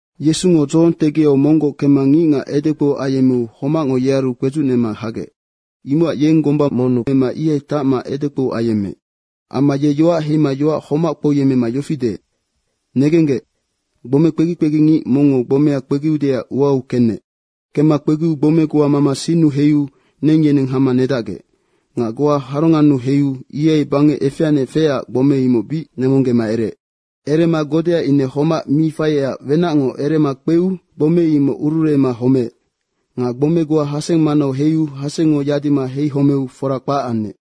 Yesungo dzohong tegiau monggoc kemma ngicngac edekpou ayemmeu homacngo yearu kpedzucnema hagec. Imocac yeng gomba monnu emma ihai tacma edekpou ayemmeec. Amma ye yoac heima yoac homac kpouyemmema yofi deec, “Negenggec, gbome kpegi kpegingic mongngo gbomea kpegiudeac uau kenec. Kemma kpegiu gbome goa mama sinnu heiu neng yeneng hama nedacgec. Nga goa harongannu heiu ihai bangec efeanec feecac gbome imoc bic nemonggema ereec. Erema godea ine homac mi faiecac wenacngo erema kpeu gbome imoc ururuema homeec. Nga gbome goa haseng manau heiu hasengngo yadima heihomeu fora kpac anec.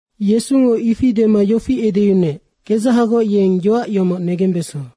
Yesungo ifi dema yofi edeyunuec, “Kedzahagoc yeng yoac yomoc negembeso.”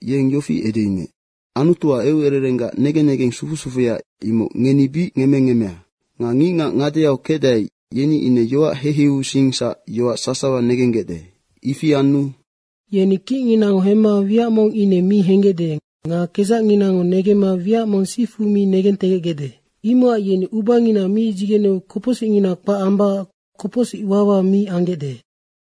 yeng yofi edeyunuec, “Anutuac eucererenggac negen negeng sufu sufuya, imoc ngeni bic ngemmengemmea. Nga ngicngac ngadeau kecdae, yeni ine yoac heiheiusingsac yoac sasawa negenggecde. Ifi anu ‘Yeni kicnginango hemma wiac mong ine mi henggecde nga kedzacnginango negemma wiac mong sifu mi negentegecgecde. Imocac yeni ubangina mi dzigeneu kopocsicngina kpac ambacac kopocsic wawa mi anggecde.’”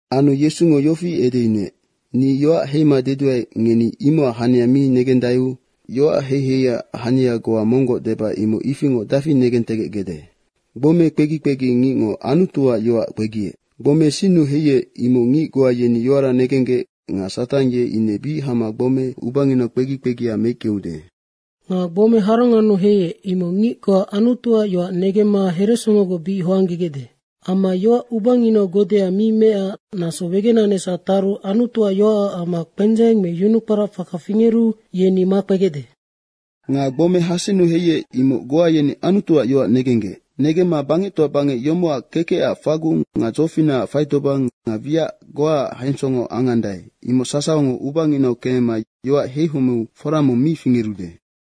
Anu Yesungo yofi edeyunuec, “Ni yoac heima deduae, ngeni imocac hania mi negendaeu yoac heiheiac hania goa monggoc deba imoc ifingoc dafi negentegecgecde. Gbome kpegi kpegi ngicngo Anutuac yoac kpegiec. Gbome sinnu heiec, imoc ngic goa yeni yoara negenggec nga Satang ye ine bic hama gbome ubanginau kpegi kpegia meickeude. Nga gbome harongannu heiec, imoc ngic goa Anutuac yoac negemma heresongogoc bic hoanggegecde. Amma yoac ubanginau godea mi meecac naso wegenanecsac taru Anutuac yoacac amma kpendzeng me yunukporac faka fingeru yeni makpegecde. Nga gbome hasennu heiec, imoc goa yeni Anutuac yoac negenggec. Negemma bangectoa bangec yomocac kekecac fagung nga dzofinacac faitobang nga wiac goaac hensongo angandae, imoc sasawango ubanginau kemema yoac heihomeu fora mong mi fingerude.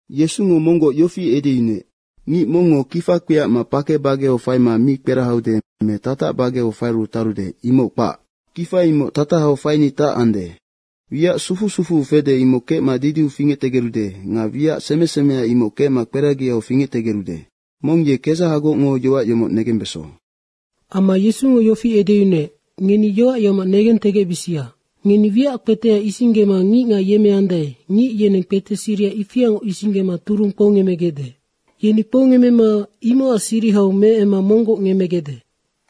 Yesungo monggoc yofi edeyunuec, “Ngic mongngo kifa kpiacma pake bageau faima mi kperahaude me tatac bageu faiu tarude, imoc kpac. Kifa imoc tatahau faini tacande. Wiac sufu sufuu fede, imoc kecma didiu fingectegerude nga wiac seme semea, imoc kecma kperagiau fingectegerude. Mong ye kedzahagocngo yoac yomoc negembeso.” Amma Yesungo yofi edeyunuec, “Ngeni yoac yomoc negentegecbisia. Ngeni wiac kpetea isinggema ngicngac yemmeandae, ngic yeneng kpete siriha ifiangoc isinggema turung kpoungemmegecde. Yeni kpoungemmema imocac sirihau meemma monggoc ngemmegecde.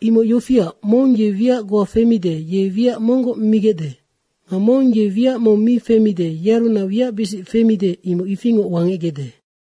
Imoc yofiac, mong ye wiac goa femide, ye wiac monggoc migecde. Nga mong ye wiac mong mi femide, yearunac wiacbisic femide, imoc ifingoc wangecgecde.”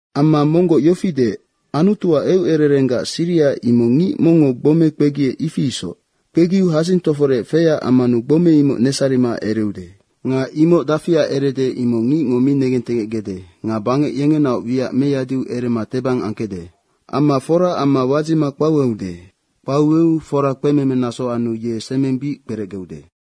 Amma monggoc yofi deec, “Anutuac eucererenggac siriha, imoc ngic mongngo gbome kpegiec, ifi isoc. Kpegiu hadzing toforec feyac ammanu gbome imoc nesarima ereude. Nga imoc dafiac erede, imoc ngicngo mi negentegecde. Nga bangec yengenaoc wiac meyadiu erema tebang angkecde. Amma fora amma wadzima kpaueude. Kpaueu fora kpememe naso anu ye semeng bic kperecgeude.”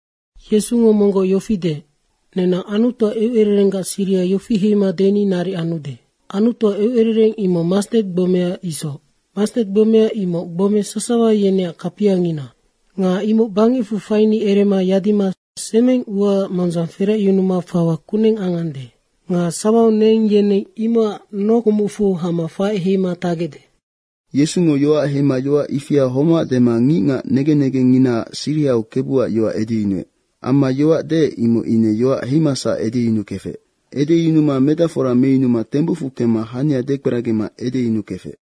Yesungo monggoc yofi deec, “Nenang Anutuac eucererenggac siriha yofi heima deni naric anude. Anutuac eucerereng imoc mastet gbomea isoc. Mastet gbomea imoc gbome sasawa yeneac kapiangina. Nga imoc bangecfu faini erema yadima semeng uaac mondzang feracyunuma fawa kuneng angande. Nga sawau neng yeneng imocac nokumucfu hama faec heima tacgecde.” Yesungo yoac heima yoac ifia homac dema ngicngac negen negengnginaac sirihau Kebuac yoac edeyunuec. Amma yoac deec, imoc ine yoac heimasac edeyunukefec. Edeyunuma medacfora meyunuma tembucfu kemma hania dekperagima edeyunukefec.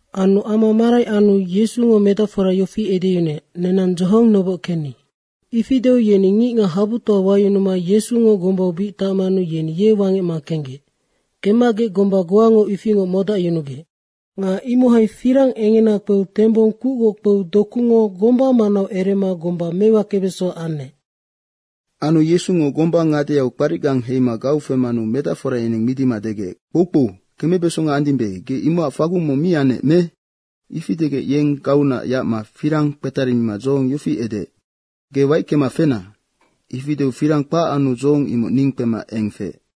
Anu ama marai anu Yesungo medacfora yofi edeyunuec, “Nenang dzohong noboc kenni.” Ifi deu yeni ngicngac habutoa wayunuma Yesu gombau bic tacmanu yeni ye wangecma kenggec. Kemmagec gomba goango ifingoc modacyunugec. Nga imohai firang engena kpeu tembong kucgoc kpeu dokungo gomba manau erema gomba mewakebeso anec. Anu Yesungo gomba ngadeau kparicgang heima gau femanu medacfora yeneng midima degec, “Kpoukpou, kemebesonga andimbe, ge imocac fagung mong mi annec me?” Ifi degec ye gauunac yacma firang kpetarimima dzohong yofi edeec, “Ge waickema fena!” ifi deu firang kpac anu dzohong imoc ning kpema eng feec.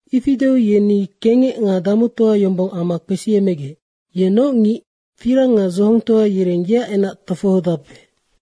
Ifi deu yeni kengec nga damutoa yombong amma kpesiemegec, “Ye noc ngic, firang nga dzohongtoa yereng yeac enac tofohodape.”